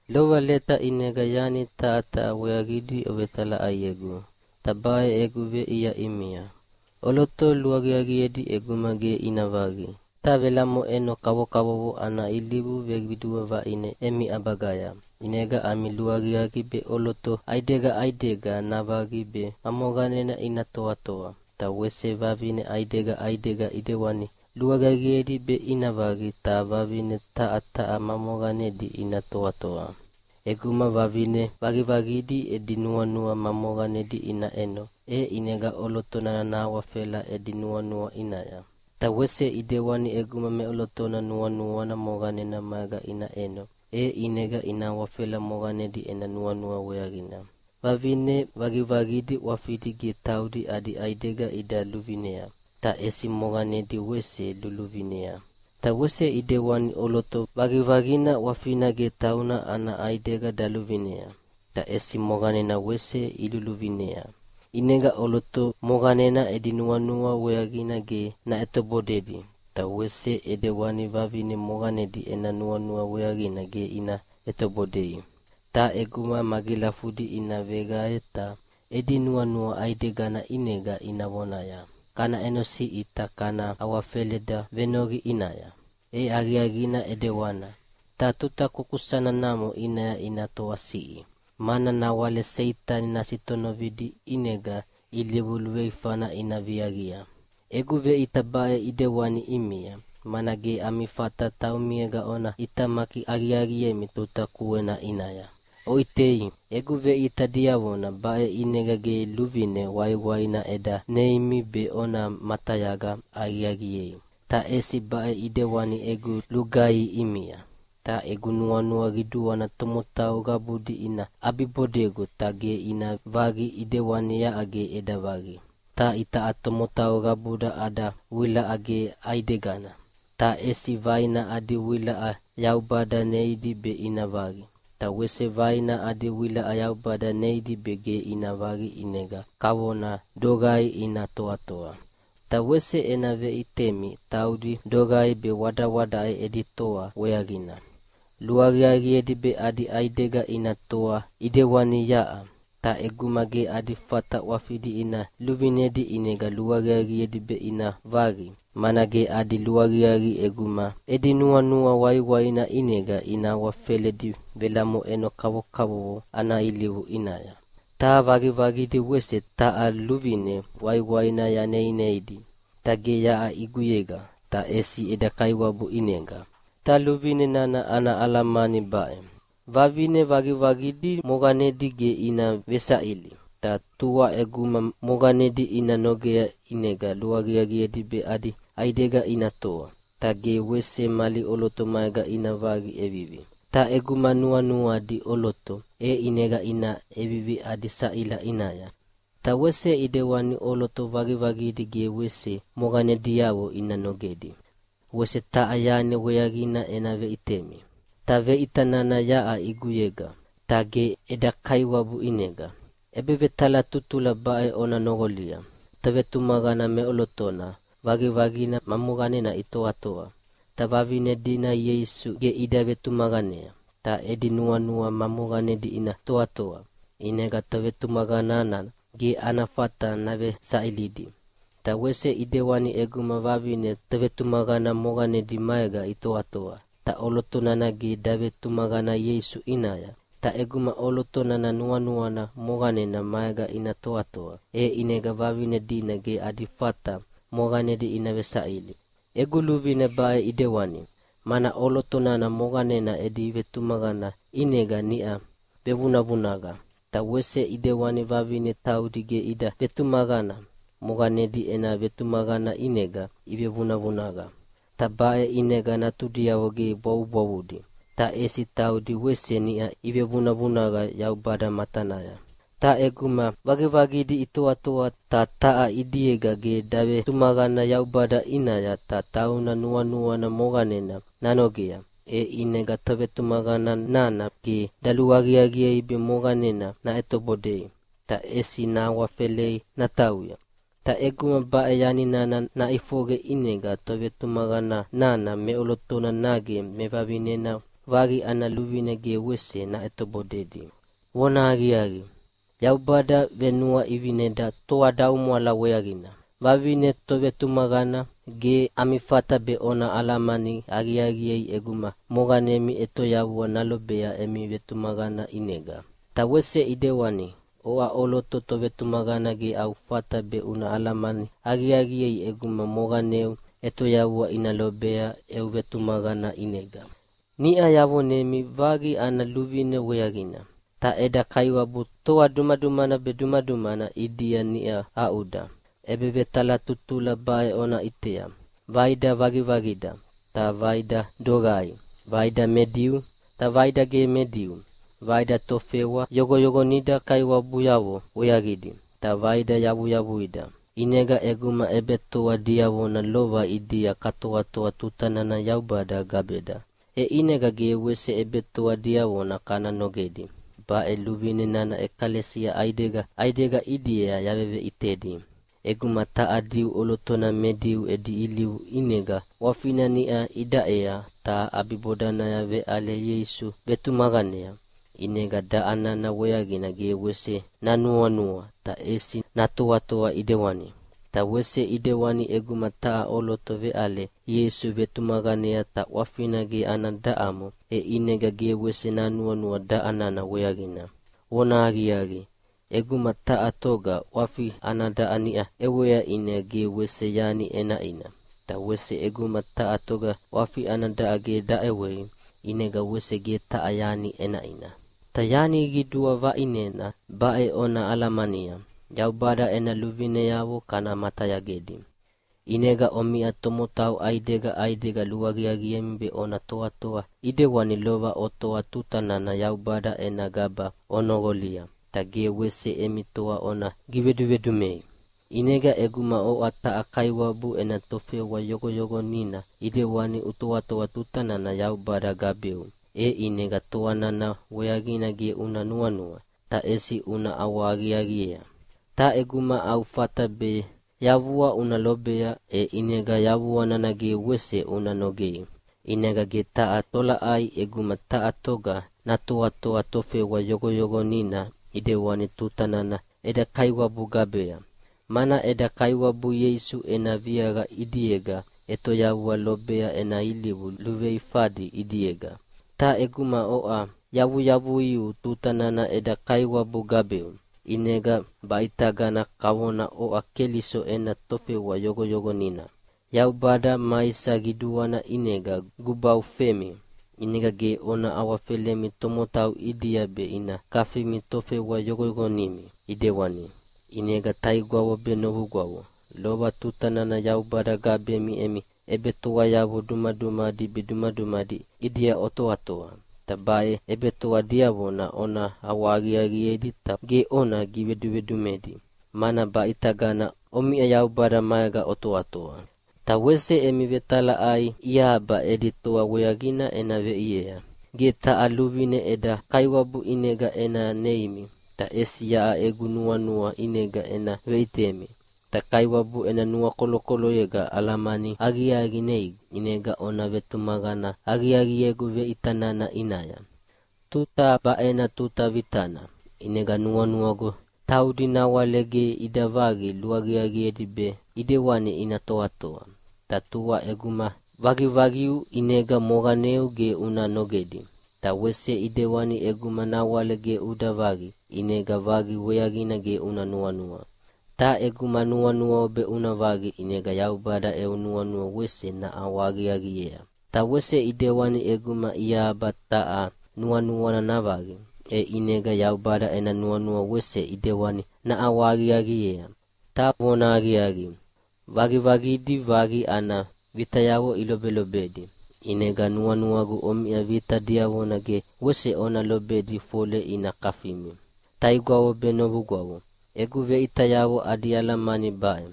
Lova leta ʼinega yani taha taha weaqidi ovetalaʼaiegu, ta baʼe egu veʼia ʼimia. ʼOloto luaqiaqiedi ʼeguma ge ina vaqi. Ta velamoʼeno kavokavovo ana ilivu veqidua vaʼine emi ʼabagaya, ʼinega ami luaqiaqi be ʼoloto ʼaidega ʼaidega navaqi be ma moqanena ina toatoa, ta wese vivine ʼaidega ʼaidega ʼidewani, luaqiaqiedi be ina vaqi ta vavine taha taha ma moqanedi ina toatoa. ʼEguma vavine vaqivaqidi edi nuanua ma moqanedi ina ʼeno, e ʼinega ʼoloto nana nahawafela edi nuanua ʼinaya. Ta wese ʼidewani ʼeguma meʼolotona nuanuana moqanena maega ina ʼeno, e ʼinega ina awafela moqanedi ena nuanua weaqina. Vavine vaqivaqidi ʼwafidi ge taudi adi ʼaidega ida luvinea, ta ʼesi moqanedi wese luluvinea. Ta wese ʼidewani ʼoloto vaqivaqina ʼwafina ge tauna ana ʼaidega daluvinea, ta ʼesi moqanena wese iluluvinea. ʼInega ʼoloto moqanena edi nuanua weaqina ge naʼetobodedi, ta wese ʼidewani vavine moqanedi ena nuanua weaqina ge ina ʼetobodei. Ta ʼeguma magilafudi ina veqae ta edi nuanua ʼaidegana ʼinega ina vonaya, “Kana ʼenosiʼi ta kana awafeleda venoqi ʼinaya.” E aqiaqina ʼidewana, ta tuta kukusana namo ʼinaya ina toasiʼi, mana nawale Seitani nasitonovidi ʼinega ilivu luveifana ina viaqia. Egu veʼita baʼe ʼidewani ʼimia, mana ge ami fata taumiega ona ʼitamaki aqiaqiemi tuta kuena ʼinaya. Oʼitei, egu veʼita diavona baʼe ʼinega ge luvine waiwaina eda neineimi be ona matayaga aqiaqiei, ta ʼesi baʼe ʼidewani egu lugaihi ʼimia. Ta egu nuanua qiduana tomotau qabudi ina ʼabibodegu ta ge ina vaqi ʼidewani yaʼa ge eda vaqi. Ta itaʼa tomotau qabuda ada wilaʼa ge ʼaidegana, ta ʼesi vaina adi wilaʼa Yaubada neidi be ina vaqi, ta wese vaina adi wilaʼa Yaubada neidi be ge ina vaqi ʼinega kavona doqai ina toatoa. Ta wese ena veʼitemi taudi doqai be wadawadaʼe edi toa weaqina. Luaqiaqiedi be adi ʼaidega ina toa ʼidewani yaʼa. Ta ʼeguma ge adi fata ʼwafidi ina luvinedi ʼinega luaqiaqiedi be ina vaqi, mana ge adi luaqiaqi ʼeguma edi nuanua waiwaina ʼinega ina awafeledi velamoʼeno kavokavovo ana ilivu ʼinaya. Ta vaqivaqidi wese taha luvine waiwaina yaneineidi. Ta ge yaʼa ʼiguyega, ta ʼesi eda Kaiwabu ʼinega. Ta luvine nana ana alamani baʼe: Vavine vaqivaqidi moqanedi ge ina vesaʼili. Ta tua ʼeguma moqanedi ina nogea ʼinega luaqiaqiedi be adi ʼaidega ina toa, ta ge wese mali ʼoloto maega ina vaqi ʼevivi. Ta ʼeguma nuanuadi ʼoloto, e ʼinega ina ʼevivi adi saʼila ʼinaya. Ta wese ʼidewani ʼoloto vaqivaqidi ge wese moqanediavo ina nogedi. Wese taha yani weaqina ena veʼitemi. (Ta veʼita nana yaʼa ʼiguyega, ta ge eda Kaiwabu ʼinega.) ʼEbevetalatutula baʼe ona noqolia: Tovetumaqana meʼolotona vaqivaqina ma moqanena itoatoa, ta vavine dina Ieisu ge ida vetumaqanea. Ta edi nuanua ma moqanedi ina toatoa, ʼinega tovetumaqana nana ge ana fata navesaʼilidi. Ta wese ʼidewani ʼeguma vavine tovetumaqana moqanedi maega itoatoa, ta ʼoloto nana ge davetumaqana Ieisu ʼinaya. Ta ʼeguma ʼoloto nana nuanuana moqanena maega ina toatoa, e ʼinega vavine dina ge adi fata moqanedi ina vesaʼili. Egu luvine baʼe ʼidewani, mana ʼoloto nana moqanena edi vetumaqana ʼinega niʼa vevunavunaqa. Ta wese ʼidewana vavine taudi ge ida vetumaqana, moqanedi ena vetumaqana ʼinega ivevunavunaqa. Ta baʼe ʼinega natudiavo ge bwavubwavudi, ta ʼesi taudi wese niʼa ivevunavunaqa Yaubada matanaya. Ta ʼeguma vaqivaqidi itoatoa ta taha ʼidiega ge davetumaqana Yaubada ʼinaya ta tauna nuanuana moqanena nanogea, e ʼinega tovetumaqana nana ge daluaqiaqiei be moqanena naʼetobodei, ta ʼesi nahawafelei natauya. Ta ʼeguma baʼe yani nana naʼifoqe ʼinega tovetumaqana nana meʼolotona nage mevavinena vaqi ana luvine ge wese naʼetobodedi. Vonahaqiaqi, Yaubada venuaʼivineda toadaumwala weaqina. Vavine tovetumaqana, ge ami fata be ona alamani aqiaqiei ʼeguma moqanemi ʼetoyavua nalobea emi vetumaqana ʼinega. Ta wese ʼidewani, oʼa ʼoloto tovetumaqana ge au fata be una alamani aqiaqiei ʼeguma moqaneu ʼetoyavua ina lobea eu vetumaqana ʼinega. Niʼa yavonemi vaqi ana luvine weaqina, ta eda Kaiwabu toa dumadumana be dumadumana ʼidia niʼa aʼuda. ʼEbevetalatutula baʼe ona ʼitea: Vaida vaqivaqida, ta vaida doqai, vaida me Diu, ta vaida ge me Diu, vaida tofewa yoqoyoqonida kaiwabuyavo weaqidi, ta vaida yavuyavuida. ʼInega ʼeguma ʼebetoa diavona lova ʼidia katoatoa tuta nana Yaubada gabeda, e ʼinega ge wese ʼebetoa diavona kana nogedi. Baʼe luvine nana ʼekalesia ʼaidega ʼaidega ʼidia yaveveʼitedi. ʼEguma taha Diu ʼolotona me Diu edi ilivu ʼinega ʼwafina niʼa idaʼea ta ʼabibodanaya veʼale Ieisu vetumaqanea, ʼinega daʼa nana weaqina ge wese nanuanua, ta ʼesi natoatoa ʼidewani. Ta wese ʼidewani ʼeguma taha ʼoloto veʼale Ieisu vetumaqanea ta ʼwafina ge ana daʼamo, e ʼinega ge wese nanuanua daʼa nana weaqina. Vonahaqiaqi, ʼeguma taha toga ʼwafi ana daʼa niʼa ʼewea ʼinega ge wese yani ʼenaʼina, ta wese ʼeguma taha toga ʼwafi ana daʼa ge daʼewei ʼinega wese ge taha yani ʼenaʼina. Ta yani qidua vaʼinena baʼe ona alamania: Yaubada ena luvineavo kana matayagedi. ʼInega omiʼa tomotau ʼaidega ʼaidega luaqiaqiemi be ona toatoa ʼidewani lova otoa tuta nana Yaubada ena gaba onoqolia, ta ge wese emi toa ona givedumedumei. ʼInega ʼeguma oʼa taha kaiwabu ena tofewa yoqoyoqonina ʼidewani utoatoa tuta nana Yaubada gabeu, e ʼinega toa nana weaqina ge una nuanua, ta ʼesi una ʼawahaqiaqiea. Ta ʼeguma au fata be yavua una lobea, e ʼinega yavua nana ge wese una nogei. ʼInega ge taha tolaʼai ʼeguma taha toga natoatoa tofewa yoqoyoqonina ʼidewani tuta nana eda Kaiwabu gabea, mana eda Kaiwabu Ieisu ena viaqa ʼidiega ʼetoyavua lobea ena ilivu luveifadi ʼidiega. Ta ʼeguma oʼa yavuyavuiu tuta nana eda Kaiwabu gabeu, ʼinega baʼitagana kavona oʼa Keliso ena tofewa yoqoyoqonina. Yaubada maisa qiduana ʼinega gubaufemi, ʼinega ge ona awafelemi tomotau ʼidia be ina kafimi tofewa yoqoyoqonimi ʼidewani. ʼInega taigwavo be novugwavo, lova tuta nana Yaubada gabemi emi ʼebetoayavo dumadumadi be dumadumadi ʼidia otoatoa. Ta baʼe ʼebetoa diavona ona ʼawahaqiaqiedi ta ge ona givedumedumedi, mana baʼitagana omiʼa Yaubada maega otoatoa. Ta wese emi vetalaʼai iahaba edi toa weaqina ena veʼiea. Ge taha luvine eda Kaiwabu ʼinega ena neimi, ta ʼesi yaʼa egu nuanua ʼinega ena veʼitemi. Ta Kaiwabu ena nuakolokoloyega alamani aqiaqi neigu, ʼinega ona vetumaqana aqiaqiegu veʼita nana ʼinaya. Tuta baʼena tuta vitana, ʼinega nuanuagu taudi nawale ge ida vaqi luaqiaqiedi be ʼidewani ina toatoa. Ta tua ʼeguma vaqivaqiu ʼinega moqaneu ge una nogedi, ta wese ʼidewani ʼeguma nawale ge uda vaqi, ʼinega vaqi weaqina ge una nuanua. Ta ʼeguma nuanuau be una vaqi ʼinega Yaubada eu nuanua wese naʼawahaqiaqiea. Ta wese ʼidewani ʼeguma iahaba taha nuanuana navaqi, e ʼinega Yaubada ena nuanua wese ʼidewani naʼawahaqiaqiea. Ta vonahaqiaqi, vaqivaqidi vaqi ana vitayavo ilobelobedi, ʼinega nuanuagu omiʼa vita diavona ge wese ona lobedi fole ina kafimi. Taigwavo be novugwavo, egu veʼitayavo adi alamani baʼe: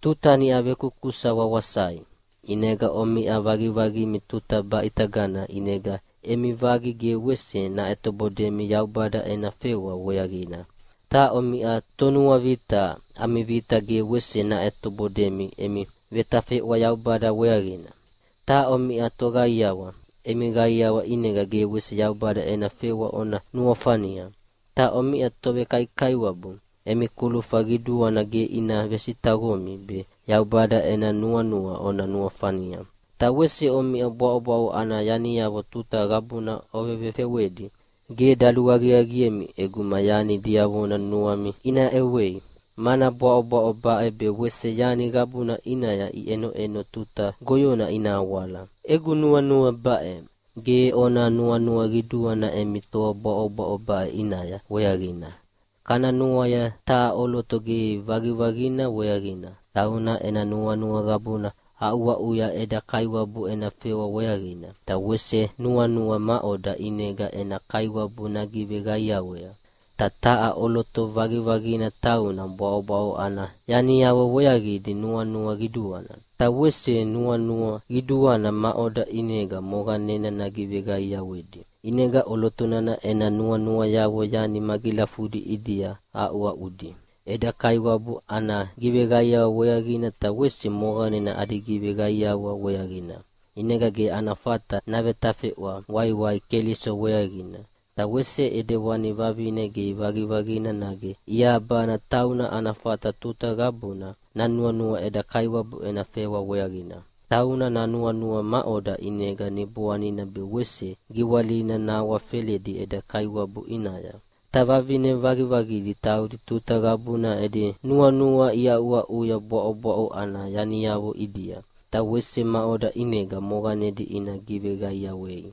Tuta niʼa vekusakusa wawasai. ʼInega omiʼa vaqivaqimi tuta baʼitagana ʼinega emi vaqi ge wese naʼetobodemi Yaubada ena fewa weaqina. Ta omiʼa tonuavita, ami vita ge wese naʼetobodemi emi vetafeʼwa Yaubada weaqina. Ta omiʼa toqaiawa, emi qaiawa ʼinega ge wese Yaubada ena fewa ona nuafania. Ta omiʼa tovekaikaiwabu, emi kulufa qiduana ge ina vesitaqomi be Yaubada ena nuanua ona nuafania. Ta wese omiʼa bwaʼobwaʼo ana yaniavo tuta qabuna ovevefewedi, ge daluaqiaqiemi ʼeguma yani diavona nuami ina ʼewei, mana bwaʼobwaʼo baʼe be wese yani qabuna ʼinaya iʼenoʼeno tuta goyona ina awala. Egu nuanua baʼe: Ge ona nuanua qiduana emi toa bwaʼobwaʼo baʼe ʼinaya weaqina. Kana nuaia taha ʼoloto ge vaqivaqina weaqina, tauna ena nuanua qabuna aʼuaʼuya eda Kaiwabu ena fewa weaqina, ta wese nuanua maʼoda ʼinega ena Kaiwabu nagiveqaiawea. Ta taha ʼoloto vaqivaqina tauna bwaʼobwaʼo ana yaniavo weaqidi nuanua qiduana, ta wese nuanua qiduana maʼoda ʼinega moqanena nagiveqaiawedi. ʼInega ʼoloto nana ena nuanuayavo yani magilafudi ʼidia aʼuaʼudi, eda Kaiwabu ana giveqaiawa weaqina, ta wese moqanena adi giveqaiawa weaqina. ʼInega ge ana fata navetafeʼwa waiwai Keliso weaqina. Ta wese ʼidewani vavine ge vaqivaqina nage iahabana tauna ana fata tuta qabuna nanuanua eda Kaiwabu ena fewa weaqina. Tauna nanuanua maʼoda ʼinega niboanina be wese giwalina nahawafeledi eda Kaiwabu ʼinaya. Ta vavine vaqivaqidi taudi tuta qabuna edi nuanua iaʼuaʼuya bwaʼobwaʼo ana yaniavo ʼidia, ta wese maʼoda ʼinega moqanedi ina giveqaiawei.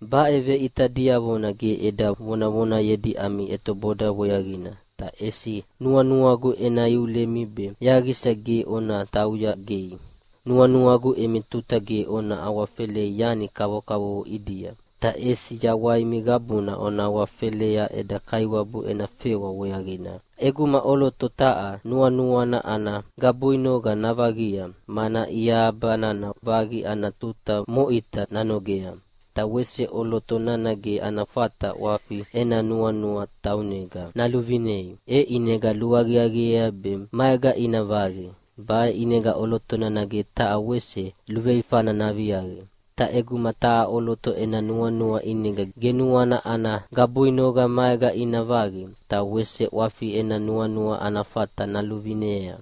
Baʼe veʼita diavona ge eda vonavonayedi ami ʼetoboda weaqina, ta ʼesi nuanuagu ena iulemi be yaqisa ge ona tauya gei. Nuanuagu emi tuta ge ona awafelei yani kavokavovo ʼidia, ta ʼesi yawaimi qabuna ona awafelea eda Kaiwabu ena fewa weaqina. ʼEguma ʼoloto taha nuanuana ana gabuinoqa navaqia, mana iahaba nana vaqi ana tuta moʼita nanogea, ta wese ʼoloto nana ge ana fata ʼwafi ena nuanua taunega naluvinei. E ʼinega luaqiaqiea be maega ina vaqi. Baʼe ʼinega ʼoloto nana ge taha wese luveifana naviaqi. Ta ʼeguma taha ʼoloto ena nuanua ʼinega ge nuana ana gabuinoqa maega ina vaqi, ta wese ʼwafi ena nuanua ana fata naluvinea,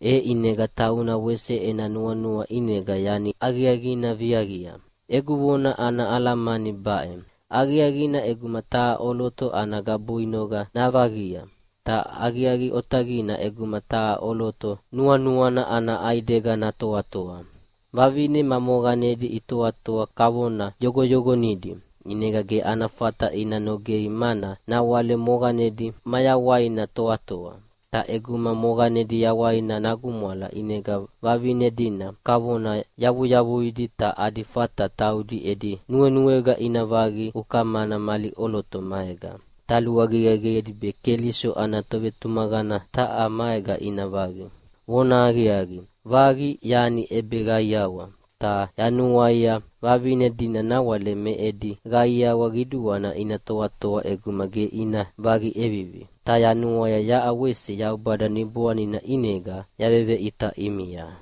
e ʼinega tauna wese ena nuanua ʼinega yani aqiaqina viaqia. Egu vona ana alamani baʼe: Aqiaqina ʼeguma taha ʼoloto ana gabuinoqa navaqia. Ta aqiaqi otaqina ʼeguma taha ʼoloto nuanuana ana ʼaidega natoatoa. Vavine ma moqanedi itoatoa kavona yoqoyoqonidi, ʼinega ge ana fata ina nogei mana nawale moqanedi mayawaina toatoa. Ta ʼeguma moqanedi yawaina nagumwala ʼinega vavine dina kavona yavuyavuidi ta adi fata taudi edi nuenuega ina vaqi ukamana mali ʼoloto maega. Ta luaqiaqiedi be Keliso ana tovetumaqana taha maega ina vaqi. Vonahaqiaqi, vaqi yani ʼebeqaiawa, ta yanuaia vavine dina nawale me edi qaiawa qiduana ina toatoa ʼeguma ge ina vaqi ʼevivi. Ta yanuaia yaʼa wese Yaubada Niboanina ʼinega yaveveʼita ʼimia.